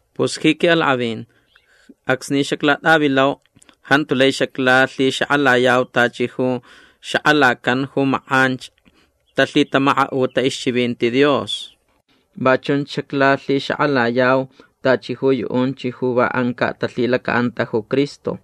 Pus ji quiʼalakʼavin acsni xaclatʼavilau jantu lai xaclalhixakʼalayau tachi ju xakʼalacan ju makʼanch talhitamakaʼuta ixchivinti Dios. Va chunch xaclalhixakʼalayau tachi ju yuʼunch ju va ancaʼ talhilacaʼanta ju Cristo.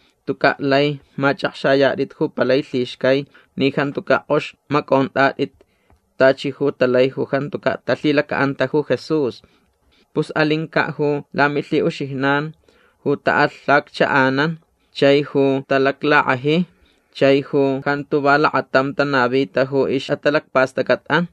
Tucaʼ lai machʼakxayatʼit ju palai lhixcai ni jantucaʼ kʼox macʼontʼatʼit tachi ju talai ju jantucaʼ talhilacaʼanta ju Jesús. Pus alincaʼ ju lamilhiʼuxijnan ju taʼalhacchaʼanan chai ju talaclakʼaji chai ju jantu va lakatam tanavita ju ixʼatalacpastʼacʼatʼan.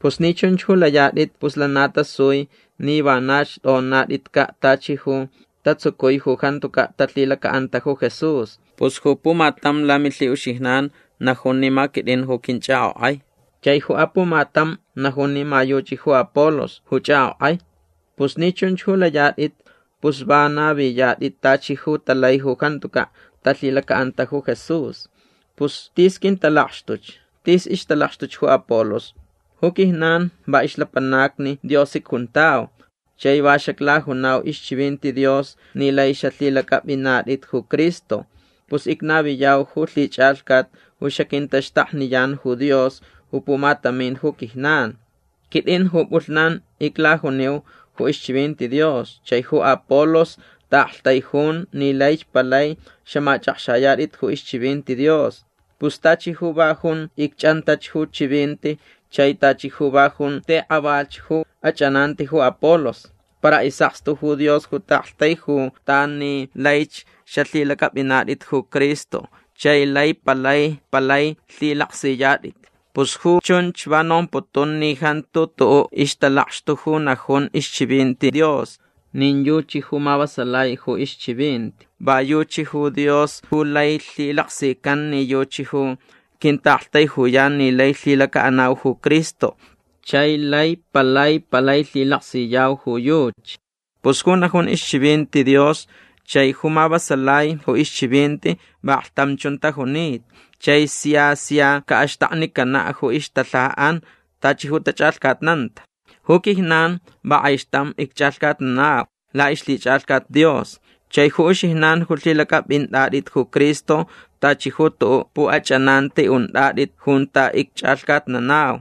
Pus ni chunch ju layatʼit pus lana tasui ni vanach tʼonatʼitcaʼ tachi ju tatsucui ju jantucaʼ talhilacaʼanta ju Jesús. Pus ju pumatam lamilhiʼuxijnan najun ni ma quitʼin ju quinchʼakʼokʼai. Chai ju apumatam najun ni ma yuchi ju Apolos ju chʼakʼokʼai. Pus ni chunch ju layatʼit pus va naviyatʼit tachi ju talai ju jantucaʼ talhilacaʼanta ju Jesús. Pus tis quintalakxtuch. Tis ixtalakxtuch ju Apolos. Ju quijnan va ixlapanacni Dios icjuntau. Chai va xaclajunau ixchivinti Dios ni lai xalhilacʼapʼinatʼit ju Cristo. Pus icnaviyau ju lhichʼalhcat ju xaquintaxtakniyan ju Dios ju pumatamin ju quijnan. Quitʼin ju pʼulhnan iclajuniu ju ixchivinti Dios chai ju Apolos taʼaktaijun ni laich palai xamachʼakxayatʼit ju ixchivinti Dios. Pus tachi ju va jun icchʼantach ju chivinti chai tachi ju va jun tikʼavalh ju achʼananti ju Apolos. Para isʼakstu ju Dios ju taʼaktaijutan ni laich xalhilacʼapʼinatʼit ju Cristo chai lai palai palai lhilaksiyatʼit. Pus ju chunch va nomputun ni jantu tuʼuʼ ixtalakxtu ju najun ixchivinti Dios. Nin yuchi ju mavasalai ju ixchivinti. Va yuchi ju Dios ju lai lhilaksican ni yuchi ju quintaʼaktaijuyan ni lai lhilacaʼanau ju Cristo chai lai palai palai lhilaksiyau ju yuchi. Pus ju najun ixchivinti Dios chai ju mavasalai ju ixchivinti vaklhtam chun tajunita. Chai sia sia caʼaxtaknicanaʼ ju ixtalhajaʼan tachi ju tachʼalhcatnanta. Ju quijnan va kʼaixtam icchʼalhcatnanau laʼixlhichʼalhcat Dios. Chai ju uxijnan ju lhilacʼapʼintʼatʼit ju Cristo tachi ju tuʼuʼ puʼachʼananti untʼatʼit junta icchʼalhcatnanau.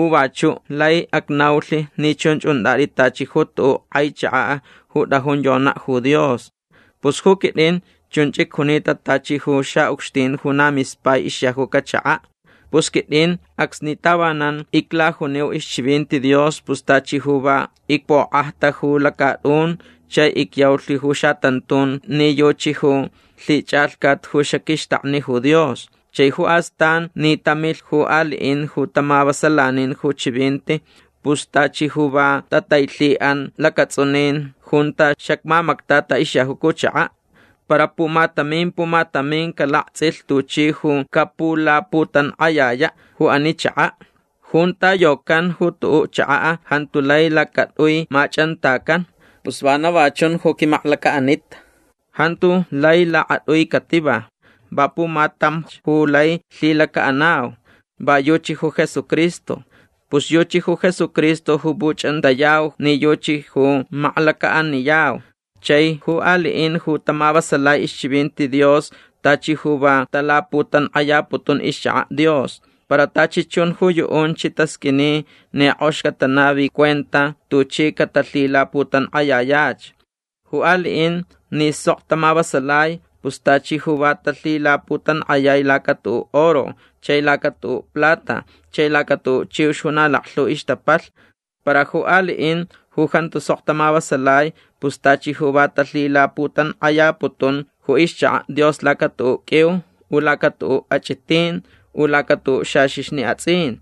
U vachuʼ lai acnaulh ni chunch untʼatʼit tachi ju tuʼuʼ kʼai chakaʼ ju tʼajun yonaʼ ju Dios. Pus ju quitʼin chunch icjunita tachi ju xaʼucxtin ju na mispai ixyajuca chakaʼ. Pus quitʼin acsni tavanan iclajuniu ixchivinti Dios pus tachi ju va icpokʼajta ju lacatʼun chai icyaulh ju xatantun ni yuchi ju lhichʼalhcat ju xaquixtakni ju Dios. Chai ju astan ni tamilh ju aliʼin ju tamavasalanin ju chivinti pus tachi ju va tatailhiʼan lacatsʼunin junta xacmamactata ixyajuca ju chakaʼ. Para pumatamin pumatamin calaktsʼilh tuchi ju capulaputankʼayayaʼ ju ani chakaʼ. Junta yocan ju tuʼuʼ chakaʼ jantu lai lacatʼui machʼantacan. Pus vana va chun ju quimaklacaʼanitʼan. Jantu lai lakatʼui cativa. Va pumatamch ju lai lhilacaʼanau. Va yuchi ju Jesucristo. Pus yuchi ju Jesucristo ju puchʼantayau ni yuchi ju maklacaʼaniyau. Chai ju aliʼin ju tamavasalai ixchivinti Dios tachi ju va talaputankʼayaputun ixchakaʼ Dios. Para tachi chun ju yuʼunch tasqʼuini ni kʼox catanavi cuenta tuchi catalhilaputankʼayayach. Ju aliʼin ni sok tamavasalai pus tachi ju va talhilaputankʼayai laca tuʼuʼ oro chai laca tuʼuʼ plata chai laca tuʼuʼ chiux ju na laklhu ixtapalh. Para ju aliʼin ju jantu sok tamavasalai pus tachi ju va talhilaputankʼayaputun ju ixchakaʼ Dios laca tuʼuʼ qʼuiu u laca tuʼuʼ achʼitin u laca tuʼuʼ xaxixni atsʼin.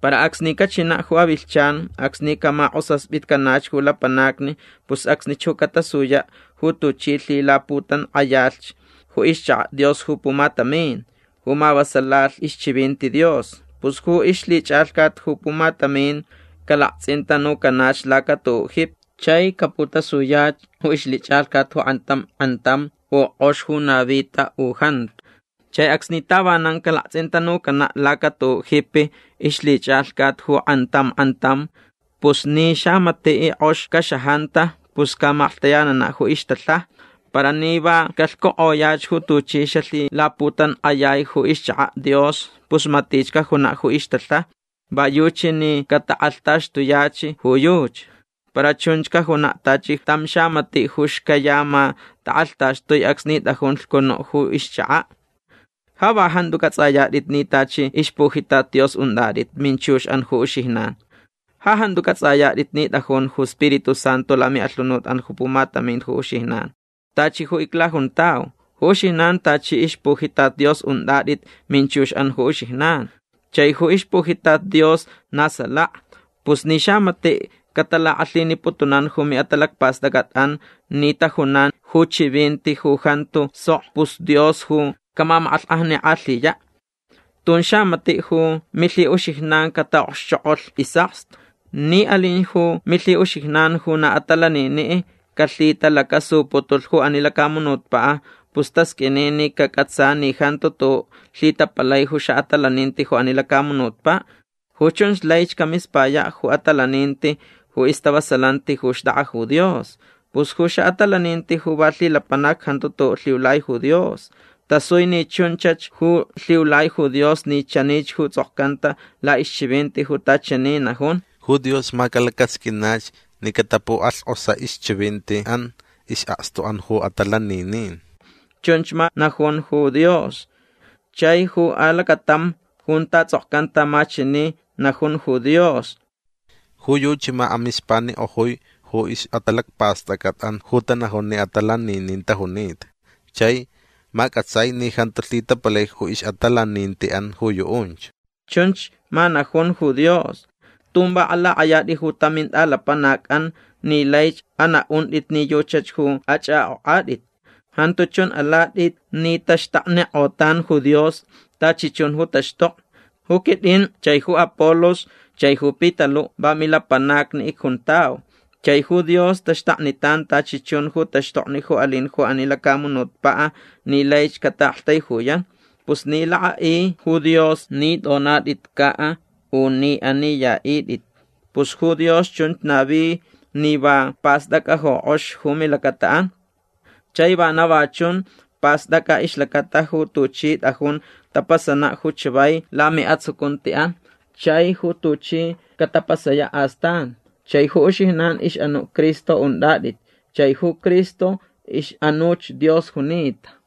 Para acsni cachinaʼ ju avilhchan acsni camakʼosaspitcanach ju lapanacni pus acsnich ju catasuyaʼ ju tuchi lhilaputankʼayalhch ju ixchakaʼ Dios ju pumatamin ju mavasalalh ixchivinti Dios. Pus ju ixlhichʼalhcat ju pumatamin calaktsʼintanucanach laca tuʼuʼ jipi. Chai caputasuyach ju ixlhichʼalhcat ju kʼantam kʼantam u kʼox ju navita u jantu. Chai acsni tavanan calaktsʼintanucanaʼ laca tuʼuʼ jipi ixlhichʼalhcat ju kʼantam kʼantam pus ni xamatiʼ kʼox caxajanta pus camaklhtayananaʼ ju ixtalhaja. Para ni va calhcukʼoyach ju tuchi xalhilaputankʼayai ju ixchakaʼ Dios pus matich cajunaʼ ju ixtalhaja. Va yuchi ni catakʼalhtaxtuyach ju yuchi. Para chunch cajunaʼ tachi tam xamatiʼ ju xcayama takʼalhtaxtui acsni tʼajun lhcunuʼ ju ixchakaʼ. Ja va jantu cʼatsʼayatʼit ni tachi ixpujitat Dios untʼatʼit minchuxʼan ju uxijnan. Ja jantu cʼatsʼayatʼit ni tʼajun ju Spiritu Santu lamiʼalhunutʼan ju pumatamin ju uxijnan. Tachi ju iclajuntau. Ju uxijnan tachi ixpujitat Dios untʼatʼit minchuxʼan ju uxijnan. Chai ju ixpujitat Dios na salaka. Pus ni xamatiʼ catalakʼalhiniputunan ju miʼatalacpastʼacʼatʼan ni tajunan ju chivinti ju jantu sok pus Dios ju camamakʼalhkʼajnikʼalhiyaʼ. Tun xamatiʼ ju milhiʼuxijnan cataʼokxchokʼolh isʼakstu. Ni alin ju milhiʼuxijnan ju na atalaniniʼ calhitalacasuputulh ju ani lacamunutpaʼ pus tasqʼuini ni cacʼatsa ni jantu tuʼuʼ lhitapalai ju xaʼatalaninti ju ani lacamunutpaʼ. Ju chunch laich camispayaʼ ju atalaninti ju istavasalanti ju xtʼakʼa ju Dios. Pus ju xaʼatalaninti ju va lhilapanac jantu tuʼuʼ lhiulai ju Dios. Tasui ni chunchach ju lhiulai ju Dios ni chanich ju tsʼokcanta laʼixchivinti junta chani najun: “Ju Dios ma calacasqʼuinach ni catapukʼalhkʼosaʼ ixchivintiʼan isʼakstuʼan ju atalaninin”. Chunch ma najun ju Dios. Chai ju alacatam junta tsʼokcanta ma chani najun ju Dios: “Ju yuchi ma amispanikʼojui ju ixʼatalacpastʼacʼatʼan ju tanajun ni atalaninin tajunita. Chai ma cʼatsai ni jantu lhitapalai ju ixʼatalanintiʼan ju yuʼunch”. Chunch ma najun ju Dios. Tun va alakʼayatʼit ju tam mintʼalapanacʼan ni laich anaʼuntʼit ni yuchach ju achʼakʼokʼatʼit. Jantu chun alatʼit ni taxtaknikʼotan ju Dios tachi chun ju taxtokni. Ju quitʼin chai ju Apolos chai ju Pitaluʼ va milapanacni icjuntau. Chai ju Dios taxtaknitan tachi chun ju taxtokni ju alin ju ani lacamunutpaʼ ni laich cataʼaktaijuyan. Pus ni lakʼaʼi ju Dios ni tʼonatʼitcaʼ u ni aniyaʼitʼit pus ju Dios chunch navi ni va pastʼacʼa ju kʼox ju milacataʼan. Chai vana va chun pastʼacʼa ixlacata ju tuchi tʼajun tapasanaʼ ju chavai lamiʼatsucuntiʼan chai ju tuchi catapasayaʼ astan. Chai ju uxijnan ixʼanuʼ Cristo untʼatʼit. Chai ju Cristo ixʼanuch Dios junita.